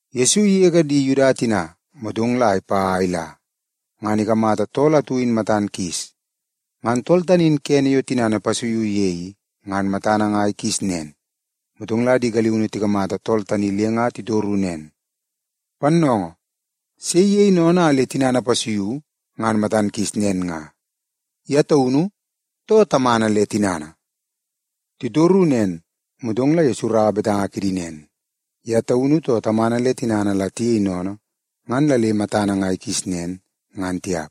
Yesu igege di Yuda tina, motong la ipa a ila, ngan ikamata tool atu in matan kis. Ngan tool tani in kene yo tinana ipasuiu ye i, ngan matana nga ikis nen. Motong la di galiunu tikamata tool tani le nga titoru nen, “Pannoongoo, sei iyei sennene a le tinana ipasuiu ngan matan kis nen nga, ye taunu, too tamana le tinana?” Titoru nen, motong la Yesu iraua betanga kidi nen, “Ye taunu, too tamana le tinana la tiyei sennene ngan la le matana nga ikis nen, ngan tiap.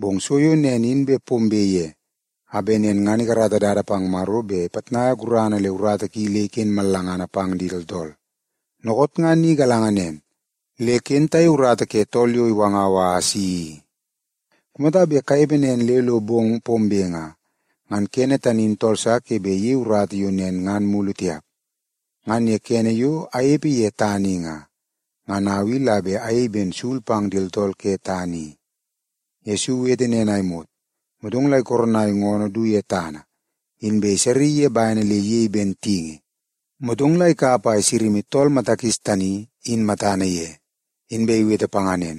Bong so yo nen in bet pombe ye, a bet nen ngan ikarata dada pang Maro bet ipitnai gurana le urata ki le iken mallangana pang di tooltool. Dookoot nga ni galanga nen, le ken tayei urata ke tool yo iwangau a asi i. Kumata bet tanepe nen le lo bong pombe nga, ngan kene tani in tool sa ke bet iyei urata yo nen ngan mulu tiap. Ngan ye kene yo anepe ye tana i nga, ngan au i la bet ayei ben sul pang di tooltool ke tana i.” Yesu iwete nen a imot, motong la ikoronai ngoonoo du ye tana, inbe isaraii ye bene le iyei ben tingi, motong ikap a isama tool mata kis tani, in matana ye. Inbe iwete panga nen,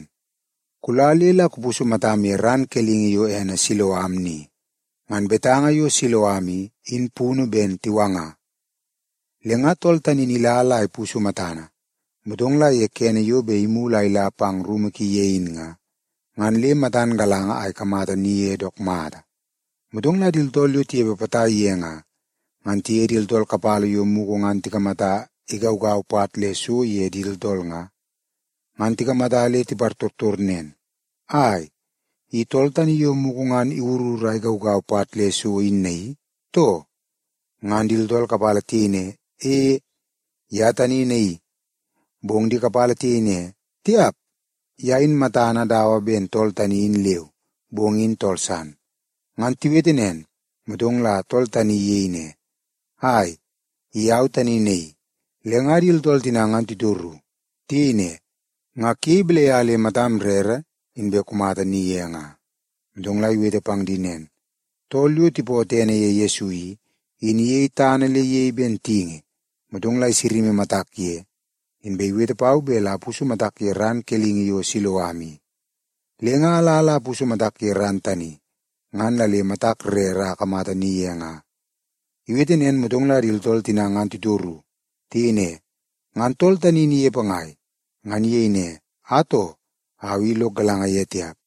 “Kula le la kupusu matam ye ran kelingi yo ene Siloam ni.” (Ngan betanga yo Siloam i, in punu ben Tiwanga). Le nga tool tani in ila la ipusu matana, motong la ye kene yo bet imulu a ila pang rumu ki ye in nga, ngan le matan galanga a ikamata ni ye dook mata. Motong la di tooltool yo tinepe potai ye nga, ngan tiye di tooltool kapala yo mugu ngan tikamata igaugau pat le so ye di tooltool nga, ngan tikamata le tipartortor nen, “Ai, i tool tani yo mugu ngan iwurur a igaugau pat le so in naii, too?” Ngan di tooltool kapala tiyei ne, “E, ye tani naii.” Bong di kapala tiyei ne, “Tiap, ye in matana dawa ben tool tani in leu, bong in tool san.” Ngan tiwete nen, motong la tool tani iyei ne, “Ai, i au tani naii.” Le nga di tooltool tina ngan titoru. Tiyei ne, “Nga kuyei balai a le matam rere, inbe kumata ni ye nga?” Motong la iwete pang di nen, “Tool yo tipootoo ene ye Yesu i, in iyei tana le iyei ben tingi, motong la isama matak ye, inbe iwete pau bet la apusu matak ye ran kelingi yo Siloam i. Le nga ala la apusu matak ye ran tani, ngan la le matak rere a akamata ni ye nga.” Iwete nen, motong la di tooltool tina ngan titoru. Tiyei ne, “Ngan tool tani in inepe ngai?” Ngan iyei ne, “Atoo, au i lok galanga ye tiap.”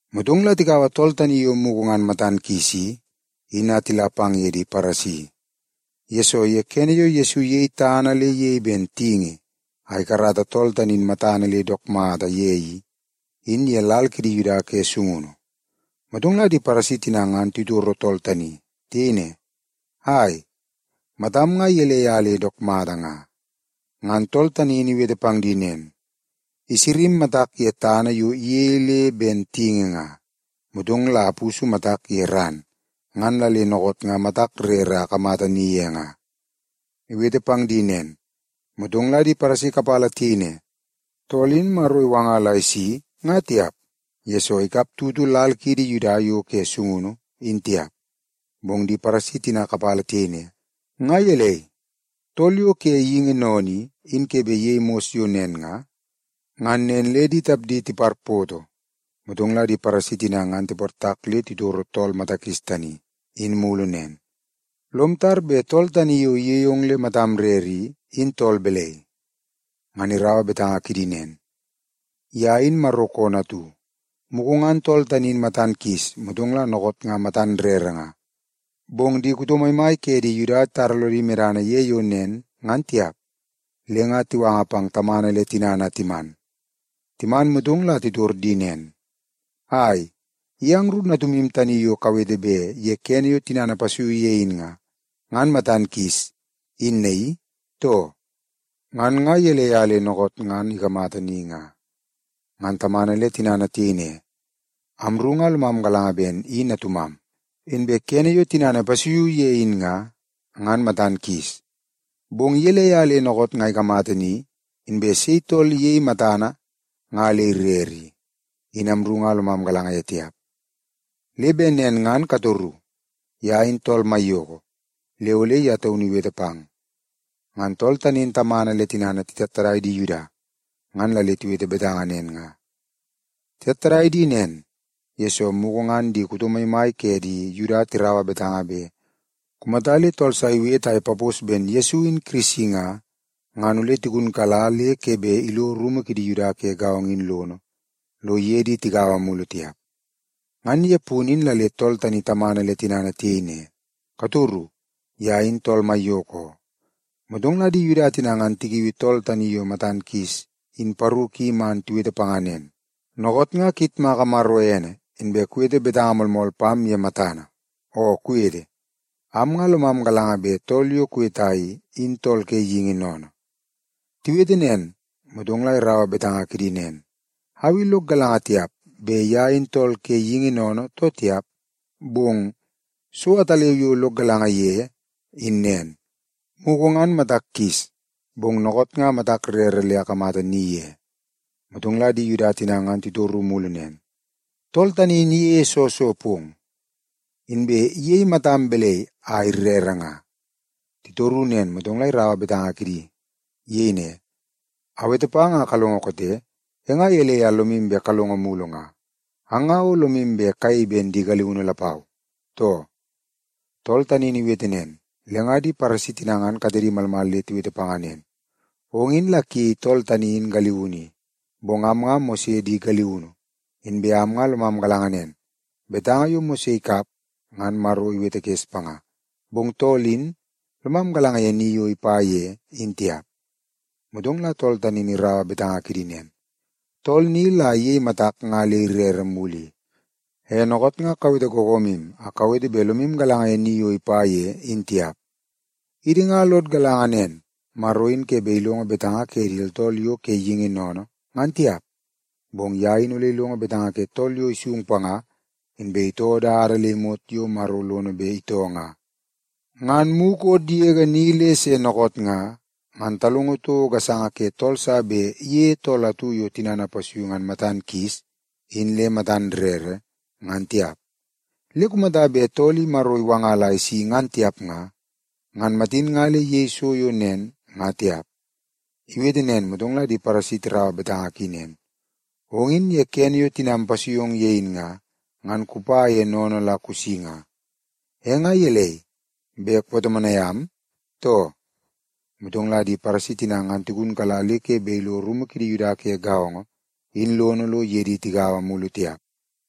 Motong la tikaua tool tani yo mugu ngan matan kis i, in a tila pang ye di Paresi. Yesoo, ye kene yo Yesu iyei tana le ben tingi a ikarata tool tani in matana le dook mata ye i, in ye lal kidi Yuda ke sungunu. Motong la di Paresi tina ngan titoro tool tani. Tiyei ne, “Ai, matam nga gelei a le dook mata nga?” Ngan tool tani in iwete pang di nen, “Isama matak ye tana yo iyei le ben tingi nga, motong la apusu matak ye ran, ngan la le dookoot nga matak rere a akamata ni ye nga.” Iwete pang di nen, motong la di Paresi kapala tiyei ne, “Tool in Maro iwanga la isi, nga tiap, yesoo ikap tutu lal kiidi Yuda yo ke sungunu, in tiap.” Bong di Paresi tina kapala tiyei ne, “Nga gelei, tool yo ke geingi sennene i, in ke bet iyei mos yo nen nga?” Ngan nen le di tapdi tiparpoto. Motong la di Paresi tina ngan tiportak bet titoro tool mata kis tani, in mulu nen, “Lom tar bet tool tani yo iyei ong le matam rere i, in tool balai?” Ngan iraua betanga kidi nen, “Ye in Maro koonoo atu.” Mugu ngan tool tani in matan kis, motong la dookoot nga matan rere nga, bong di kuto maimai ke di Yuda titara lodi medana ye yo nen, ngan tiap. Le nga tiwanga pang tamana le tinana a timan. Timan, motong la titor di nen, “Ai, i angru natumu tani yo kawete bet ye kene yo tinana ipasuiu ye in nga, ngan matan kis, in naii, too? Ngan nga gelei a le dookoot ngan ikamata ni nga?” Ngan tamana le tinana tiyei ne, “Amru nga lomam galanga ben i natumam, inbe kene yo tinana ipasuiu ye in nga, ngan matan kis. Bong gelei a le dookoot nga ikamata ni, inbe sei tool iyei matana nga le irere i, in amru nga lomam galanga ye tiap. Le bet nen ngan katoru. Ye in tool maiyoko, le ole ye taunu iwete pang.” Ngan tool tani in tamana le tinana titattadai di Yuda, ngan la le tiwete betanga nen nga. Titattadai di nen, yesoo mugu ngan di kuto maimai ke di Yuda tiraua betanga bet kumata le tool sa iwete a ipapos ben Yesu in Kirisi nga, ngan ole tigunkala le ke bet ilo rumu kidi Yuda ke gaongo in lono lo iye di tigaua mulu tiap. Ngan ye punu in la le tool tani tamana le tinana tiyei ne, “Katoru. Ye in tool maiyoko oo.” Motong la di Yuda tina ngan tikiui tool tani yo matan kis in paru ki man tiwete panga nen, “Dookoot nga kuyitmaka Maro ene, inbe kuwete betanga moolmool pam ye matana. Oo kuwete, am nga lomam galanga bet tool yo kuweta i, in tool ke geingi sennene.” Tiwete nen, motong la iraua betanga kidi nen, “Au i lok galanga tiap bet ye in tool ke geingi sennene, too tiap. Bong so ataleu yo lok galanga ye, in nen, mugu ngan matak kis, bong dookoot nga matak rere le akamata ni ye.” Motong la di Yuda tina ngan titoru mulu nen, “Tool tani in iyeie soo so pong? Inbe iyei matam balai a irere nga?” Titoru nen, motong la iraua torungu kidi. Iyei ne, “Awete pang a kalongo koote. E nga gelei a lomu bet kalongo mulu nga? Ang nga o lomu bet kayei ben di galiunu lapau, too?” Tool tani in iwete nen, le nga di Paresi tina ngan katedi malmal le tiwete panga nen, “Ong in la kuyei tool tani in galiunu i. Bong am nga Mose di galiunu. Inbe am nga lomam galanga nen, betanga yo Mose ikap, ngan Maro iwetekes panga. Bong tool in, lomam galanga ye ni yo ipa ye, in tiap.” Motong la tool tani in iraua betanga kidi nen, “Tool ni la iyei matak nga le irere mulu i. E, dookoot nga kawete googoomu a kawete bet lomu galanga ye ni yo ipa ye, in tiap. Idi nga lod galanga nen, Maro in ke bet ilongo betanga ke di tooltool yo ke geingi sennene, ngan tiap. Bong ye in ole ilongo betanga ke tool yo isung panga, inbe itoo dada le imot yo Maro lono bet itoo nga. Ngan mukot yege ni le se dookoot nga, ngan talongo toko gasanga ke tool sa bet iyeie tool atu yo tinana ipasuiu ngan matan kis in le matan rere, ngan tiap. Le kumata bet tool i Maro iwanga la isi ngan tiap nga, ngan matin nga le iyei so yo nen, nga tiap.” Iwete nen, motong la di Paresi tiraua betanga ki nen, “Ong in ye kene yo tinam ipasui ong ye in nga, ngan kupa ye sennene la kusi nga. E nga gelei, bet kupatomonai am, too?” Motong la di Paresi tina ngan tigunkala le ke bet ilo rumu kidi Yuda ke gaongo in lono lo iye di tigaua mulu tiap.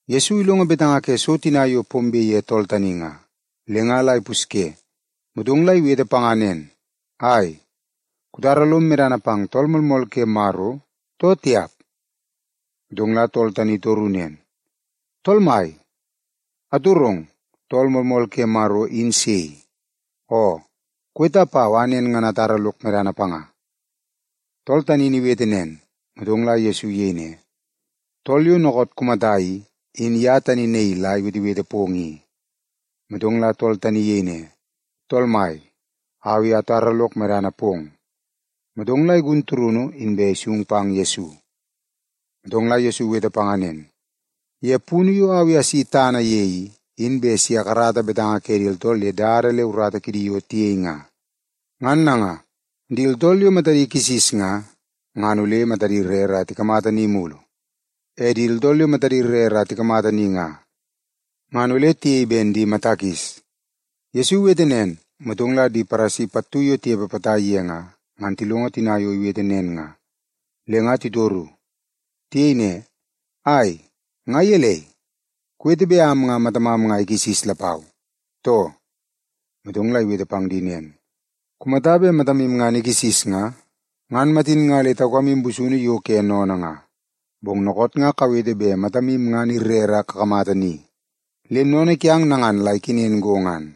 Yesu ilongo betanga ke so tina yo pombe ye tool tani nga, le nga la ipusye, motong la iwete panga nen, “Ai, kutara lom medana pang Tool Moolmool ke Maro, too tiap?” Motong la tool tani itoru nen, “Tool mai, atorong, Tool Moolmool ke Maro, in sei? Oo, kuweta pau a nen ngan atara lok medana panga.” Tool tani in iwete nen, motong la Yesu iyei ne, “Tool yo dookoot kumata i, in ye tani naii la iwetewete pong i.” Motong la tool tani in iyei ne, “Tool Mai, au i atara lok medana pong.” Motong la igun turunu, inbe isung pang Yesu. Motong la Yesu iwete panga nen, “Ye punu yo au i asi tana ye i, in bet si akarata betanga ke di tooltool ye dada le urata kidi yo tiyei nga. Ngan nanga, di tooltool yo matadi kisis nga, ngan ole matadi rere a tikamata ni mulu. E di tooltool yo matadi rere a tikamata ni nga, ngan ole tiyei ben di mata kis.” Yesu iwete nen, motong la di Paresi pattu yo tinepe potai ye nga, ngan tilongo tina yo iwete nen nga, le nga titoru. Tiyei ne, “Ai, nga gelei? Kuwete bet am nga matamam nga ikisis lapau, too?” Motong la iwete pang di nen, “Kumata bet matamu ngan ikisis nga, ngan matin nga le taukamu busunu yo ke sennene nga. Bong dookoot nga kawete bet matamu ngan irere a kakamata ni, le sennene kiang nangan la ikenen go ngan.”